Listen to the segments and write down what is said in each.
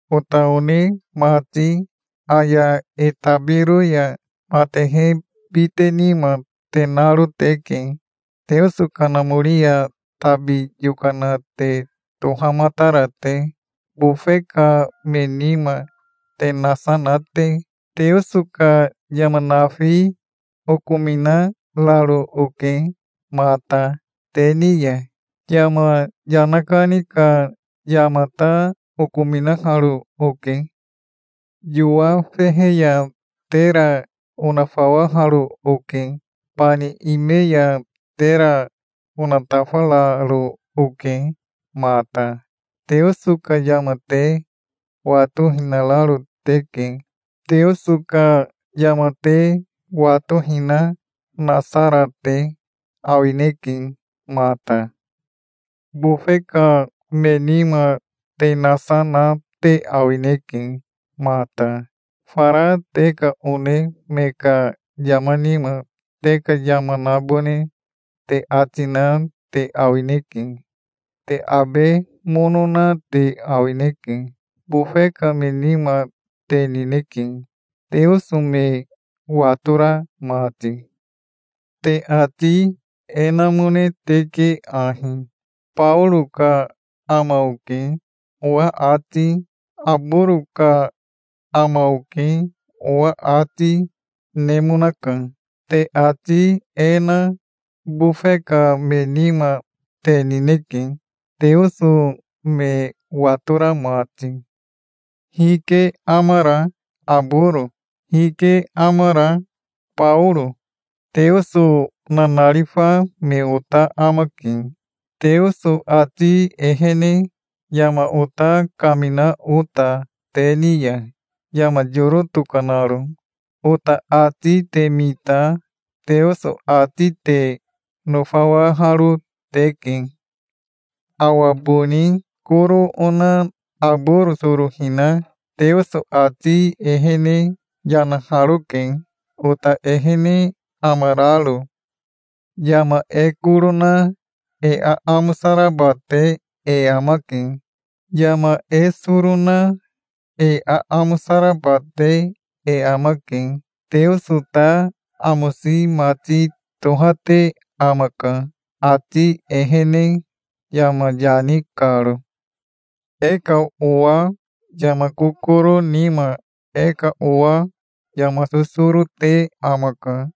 Ota one mati, aya e tabiro ya matehe bite nima te naro teke, Teoso Kanamori ya tabi yokana te tohamatara te, bofe ka me nima te nasa na te. Teoso ka yama nafi okominararo oke mata te ni ya. Yama yana kani ka yama ta okominaharo oke. Yowa fehe ya tera onafawaharo oke. Bani ime ya tera onatafararo oke mata. Teoso ka yama te watohinararo teke. Teoso ka yama te watohina nasa ra te awineke mata. Bofe ka me nima te nasa na te awineke mata. Fara te ka one me ka yama nima te ka yama nabone te ati na te awineke. Te abe mono na te awineke. Bofe ka me nima te nineke, Teoso me watora mati. Te ati e namone teke ahi: "Baoro ka ama oke", owa ati, "Aboro ka ama oke", owa ati, nemonaka. Te ati e na bofe ka me nima te nineke, Teoso me watora mati. Hike amara Aboro? Hike amara Baoro? Teoso nanarifa me ota amake, Teoso ati ehene yama ota kamina ota te ni ya, yama yoro tokanaro. Ota ati te mita Teoso ati te nofawaharo teke. Awa boni koro ona Aboro soro hina Teoso ati ehene yanaharoke, ota ehene amararo. Yama e koro na e aamosa raba te e amake. Yama e soro na e aamosa raba te e amake. Teoso ta amosi mati tohate amaka, ati ehene yama yani karo. E ka owa yama kokoro nima e ka owa yama sosoro te amaka.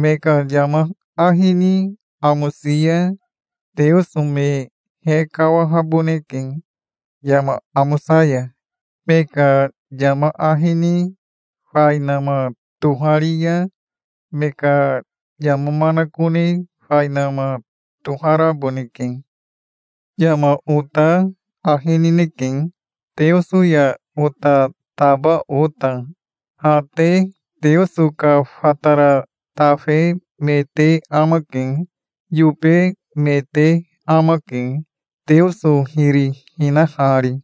Me ka yama ahi ni amosi ya Teoso me hekawahaboneke yama amosa ya. Me ka yama ahi ni fainama tohari ya me ka yama manakone fainama toharaboneke. Yama ota ahi nineke, Teoso ya ota taba ota. Ha te Teoso ka fatara tafe me te amake. Yobe me te amake, Teoso hiri hinahari.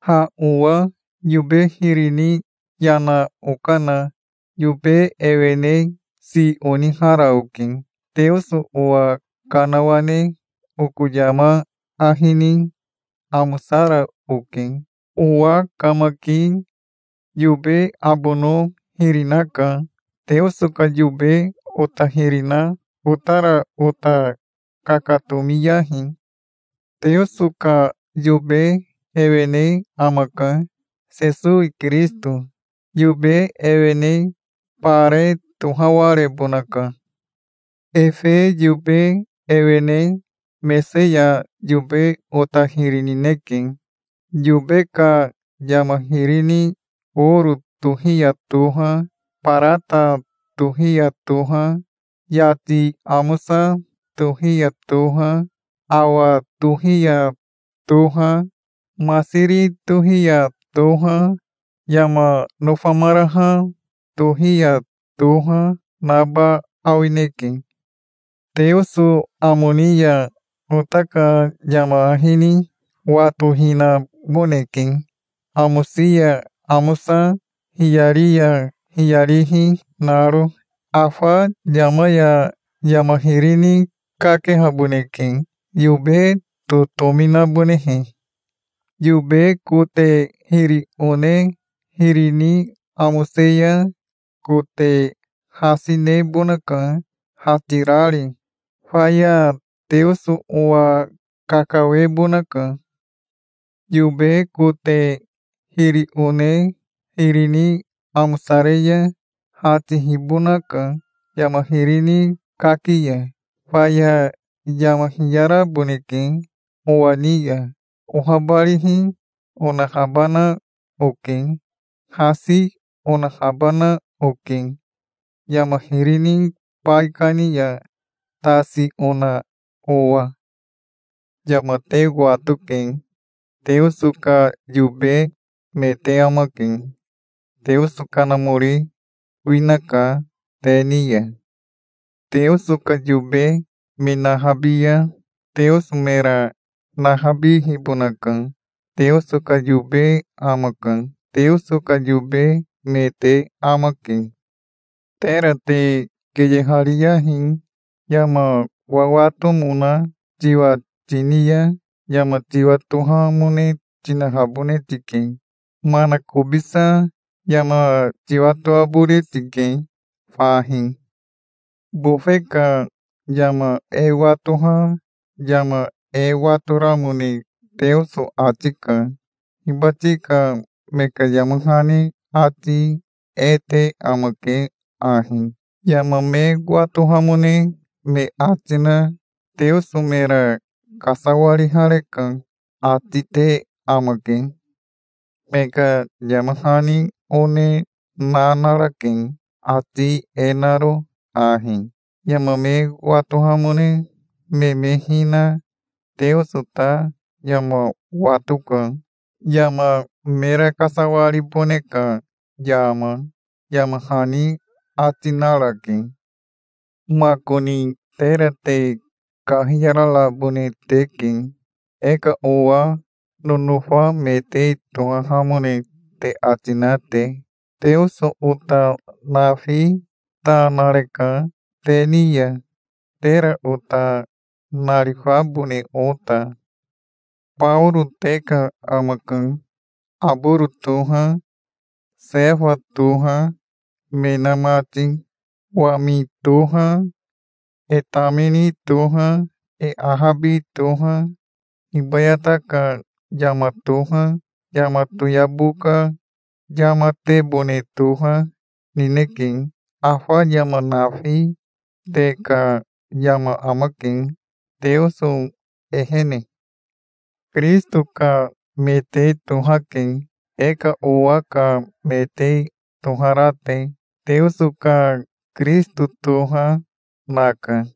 Ha owa yobe hiri ni yana okana yobe ewene si onihara oke. Teoso owa kanawane oko yama ahi ni amosara oke. Owa kamaki yobe abono hiri naka. Teoso ka yobe ota hiri na otara ota kakatomiyahi. Teoso ka yobe ewene amaka, Sesowi Kirisito. Yobe ewene bare tohawarebonaka. Efe yobe ewene mese ya yobe ota hiri nineke. Yobe ka yama hiri ni oro tohi ya toha, barata tohi ya toha, yati amosa tohi ya toha, awa tohi ya toha, masiri tohi ya toha, yama nofamaraha tohi ya toha naba awineke. Teoso amo ni ya ota ka yama ahi ni watohinaboneke, amosi ya amosa, hiyari ya hiyarihi naro. Afa yama ya yama hiri ni kakehaboneke, yobe totomi nabonehe. Yobe kote hiri one hiri ni amose ya kote hasi nebonaka, hatirari. Faya Teoso owa kakawebonaka. Yobe kote hiri one hiri ni amosare ya hatihibonaka yama hiri ni kaki ya. Faya yama hiyaraboneke owa ni ya. Ohabarihi onahabana oke. Hasi onahabana oke yama hiri ni baikani ya tasi ona owa. Yama te watoke. Teoso ka yobe me te amake. Teoso Kanamori winaka te ni ya. Teoso ka yobe me nahabi ya Teoso mera nahabihibonaka. Teoso ka yobe amaka. Teoso ka yobe me te amake. Tera te keyehariyahi. Yama wawatomona tiwa tini ya yama tiwatorahamone tinahabone tike. Manakobisa yama tiwatoabone tike fahi. Bofe ka yama e watoha yama e watoramone Teoso ati ka. Hibati ka me ka yama hani ati e te amake ahi: "Yama me watohamone me ati na Teoso mera kasawarihareka", ati te amake. Me ka yama hani one na narake, ati e naro ahi: Yama me watohamone me me hina Teoso ta yama watoka, yama mera kasawaribone ka yama", yama hani ati narake. Makoni tera te kahiyararabone teke, e ka owa nonofa me te tohahamone te ati na te. Teoso ota nafi ta nareka te ni ya, tera ota narifabone ota. Baoro te ka amaka, Aboro toha, Sefa toha, me na mati. Wami toha, e tamini toha, e ahabi toha, hibayata ka yama toha, yama toyabo ka yamatebone toha, nineke. Afa yama nafi te ka yama amake, Teoso ehene. Kirisito ka me te tohake, e ka owa ka me te tohara te. Teoso ka Kirisito toha, naka.